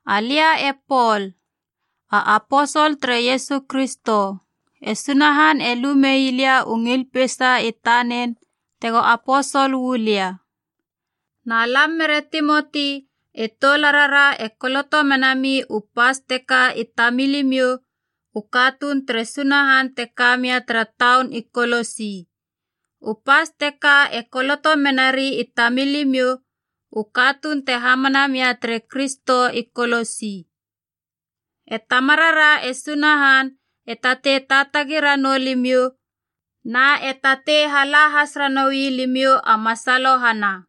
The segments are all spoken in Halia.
Alia e Pol, a aposol tere Iesu Kristo. E Sunahan e lu meilia u ngil peisa i tanen tego aposol uu lia. Na lam mere Timoti e toularara e koloto menami u pas teka i tamilimiou u katuun tere Sunahan te ka mia tara taun i Kolosi. U pas teka e koloto menari i tamilimiou u katuun te hamana mia tere Kristo i Kolosi. E Tamarara e Sunahan e tatei taatagi ranou limiou na e tatei hala has ranoui limiou a masalohana.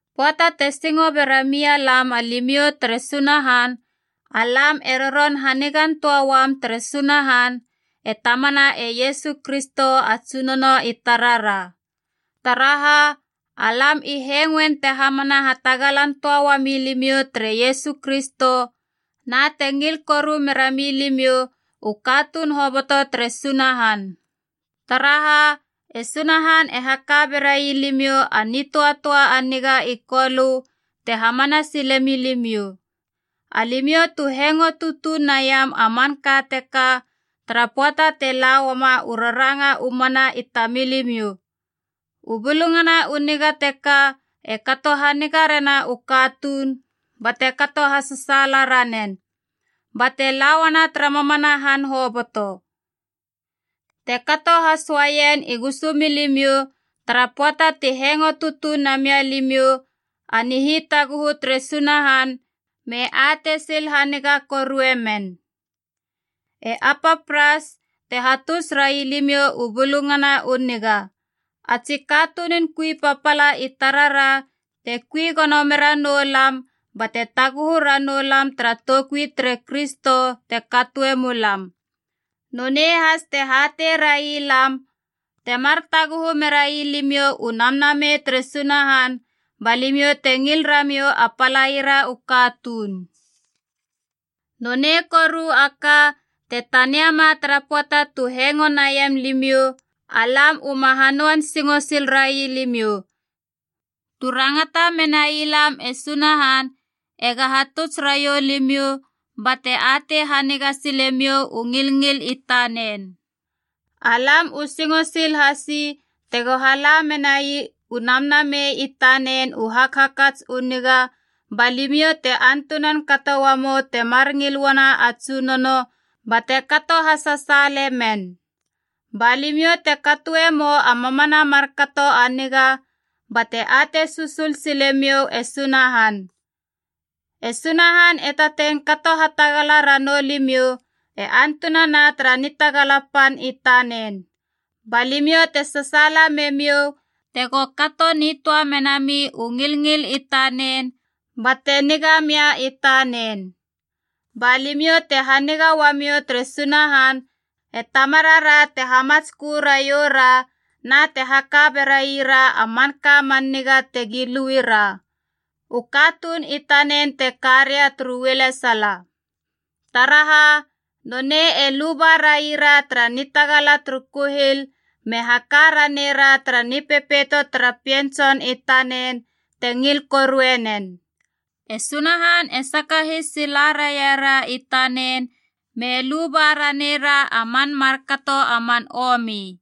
Pöata te singo bera mia lam alimiou tere Sunahan, alam e roron hanigan töa uam tere Sunahan, e Tamana e Iesu Kristo a Tsunono i tarara. Taraha, alam i hengoen te hamana hatagalan töa uami limiou tere Iesu Kristo na te ngil koru mera milimiou u katuun hoboto tere Sunahan. Taraha e Sunahan e haka berai limiou a nitöatöa a niga i Kolö te hamana sile milimiou. Alimiou tu hengo tutuneiam a manka teka tara pöata te la uama u raranga u mana i tamilimiou. U Bulungana u Niga teka e kato haniga rena u katuun bate kato hasasaala ranen, bate la uana tara mamana han hoboto. Te kato has uaien i gusu milimiou tara pöata ti hengo tutuun namia limiou a nihitaguhu tere Sunahan me atei sil haniga korue men. E Epapras te hatuts railimiou u Bulungana u Niga, a tsi katunun kui papala i tarara te kui gono mera noulam bate taguhu ranoulam tara toukui tere Kristo te katoe mulam. Nonei has te hatei railam temar taguhu merai limiou u Namnamei tere Sunahan ba limiou te ngil ramiou a palaira u katuun. Nonei koru a ka, te taniama tara pöata tu hengo naien limiou, alam uma hanöan singo sil rai limiou, tu rangata menai lam e Sunahan ega hatuts raiou limiou bate atei haniga sile miou u ngilngil i tanen. Alam u singo sil hasi tega hala menai u Namnamei i tanen u hakhakats u niga, ba limiou te antunan kato uamou temar ngil uana a Tsunono bate kato hasasaale men. Ba limiou te katoe mou a mamana markato a niga bate atei susul sile miou e Sunahan. E Sunahan e tatei kato hatagala ranou limiou e antunana tara nitagala pan i tanen, ba limiou te sasaala memiou tego kato nitöa menami u ngilngil i tanen bate niga mia i tanen. Ba limiou te haniga uamiou tere Sunahan e Tamarara te hamatskö raioura na te haka beraira a manka man niga tegi lui ra, u katuun i tanen te ka ria turu ualesala. Taraha, nonei e luba raiara tara nitagala turu kuhil me haka renara tara nipepeito tara Pien Tson i tanen te ngil korue nen. E Sunahan e sakahis sila raiara i tanen me luba ranera a man markato a man omi.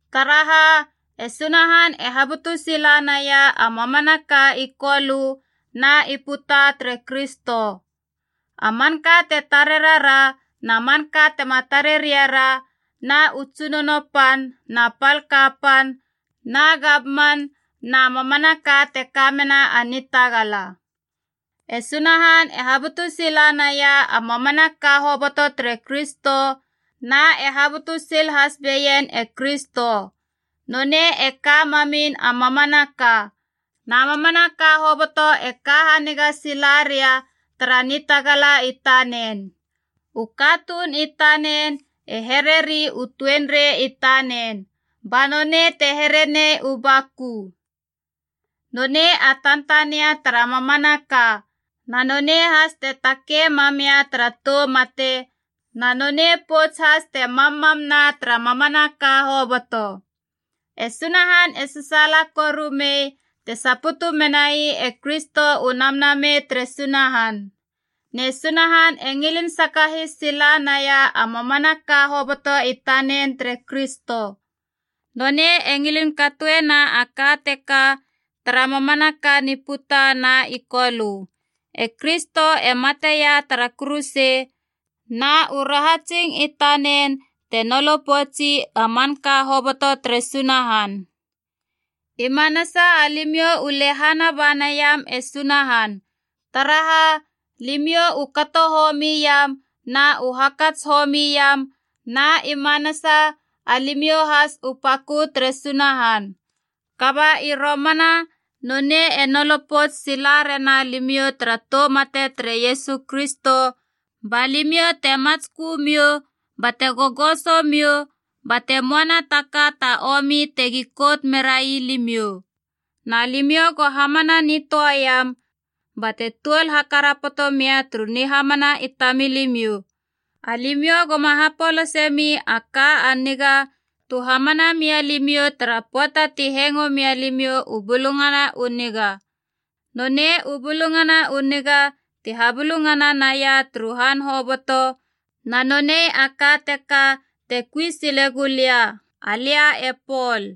Taraha, e Sunahan e habutu sila naia a mamanaka i kolö na i puta tere Kristo. A manka te tare rara na manka tema tare rei ra na u tsunono na pal kapan na gamman na mamanaka te kamena a nitagala. E Sunahan e habutu sila naia a mamanaka hoboto tere Kristo na e habutu sil has beien e Kristo. Nonei e ka mamin a mamanaka, na mamanaka hoboto e ka haniga sila ria tara nitagala i tanen. U katuun i tanen e hereri u tuenrei i tanen, ba nonei te here nei u baku. Nonei a tantania tara mamanaka, na nonei has te takei mamia tara tou mate, na nonei pouts has te mammamna tara mamanaka hoboto. E Sunahan e sasaala koru mei te saputu menai e Kristo u Namnamei tere Sunahan. Ne Sunahan e ngilin sakahis sila naia a mamanaka hoboto i tanen tere Kristo. Nonei e ngilin katoena a ka teka tara mamanaka ni puta na i kolö. E Kristo e mateia tara kuruse na u rahatsing i tanen te nolo poutsi a manka hoboto tere Sunahan. I manasa alimiou u lehana ba naiam e Sunahan, taraha limiou u kato homi iam na u hakats homi iam na i manasa alimiou has u pakö tere Sunahan. Kaba i romana nonei e nolo pouts sila rena limiou tara tou mate tere Iesu Kristo, ba limiou te matskö miou bate gogoso miou, bate moana ta ka ta omi tegi kout merai limiou. Na limiou go hamana nitöaiam bate tuol hakarapoto mia turu nihamana i tamilimiou. Alimiou goma hapolase mi a ka a niga tu hamana mia limiou tara pöata ti hengoe mia limiou u Bulungana u Niga. Nonei u Bulungana u Niga ti habulungana naia turu han hoboto, na nonei a ka teka te kui sile gulia, alia e Pol.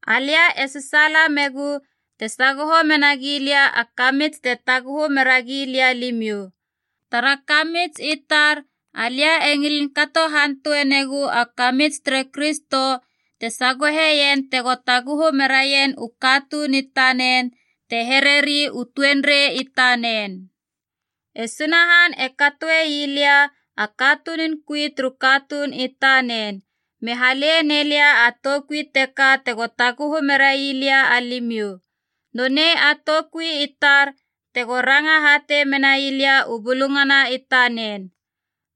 Alia e sasaala megu te sagoho mena gilia a kamits te taguhu mera gilia alimiou. Tara kamits i tar alia e ngilin kato hantue negu a kamits tere Kristo te sagoheien tego taguhu meraien u katuun i tanen, te hereri u tuenrei i tanen. E Sunahan e katoe ii lia a katunun kui turu katuun i tanen, me hale nei lia a toukui teka tego taguhu merai lia alimiou. Nonei a toukui i tar tego ranga hatei menai lia u bulungana i tanen.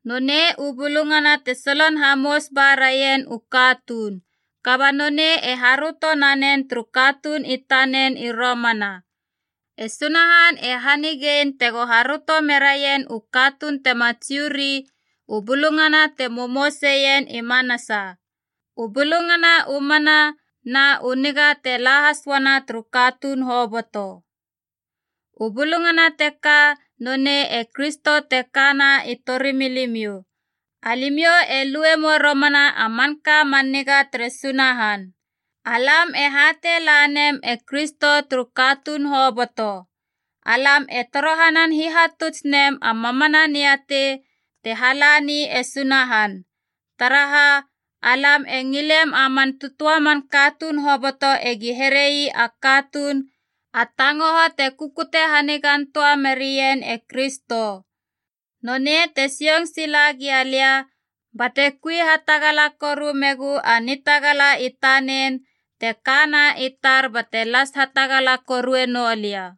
Nonei u bulungana te solon hamous ba rien u katuun, kaba nonei e haröto nanen turu katuun i tanen i romana. E Sunahan e hanigein tego haröto meraien u katuun tema Jiu ri u bulungana te momouseien i manasa, u bulungana u mana na u niga te la has uana turu katuun hoboto. U bulungana teka nonei e Kristo te kana i tori milimiou, alimiou e luemou romana a manka man niga tere Sunahan. Alam e hatei lanem e Kristo turu katuun hoboto. Alam e torohanan hihatuts nem a mamana niatei te halani e Sunahan. Taraha, alam e ngilem a man tötöa man katuun hoboto egi herei a katuun a tangoho te kukute hanigan töa merien e Kristo. Nonei te sioung sila gialia bate kui hatagala koru megu a nitagala i tanen te kana i tar bate las hatagala korue noulia.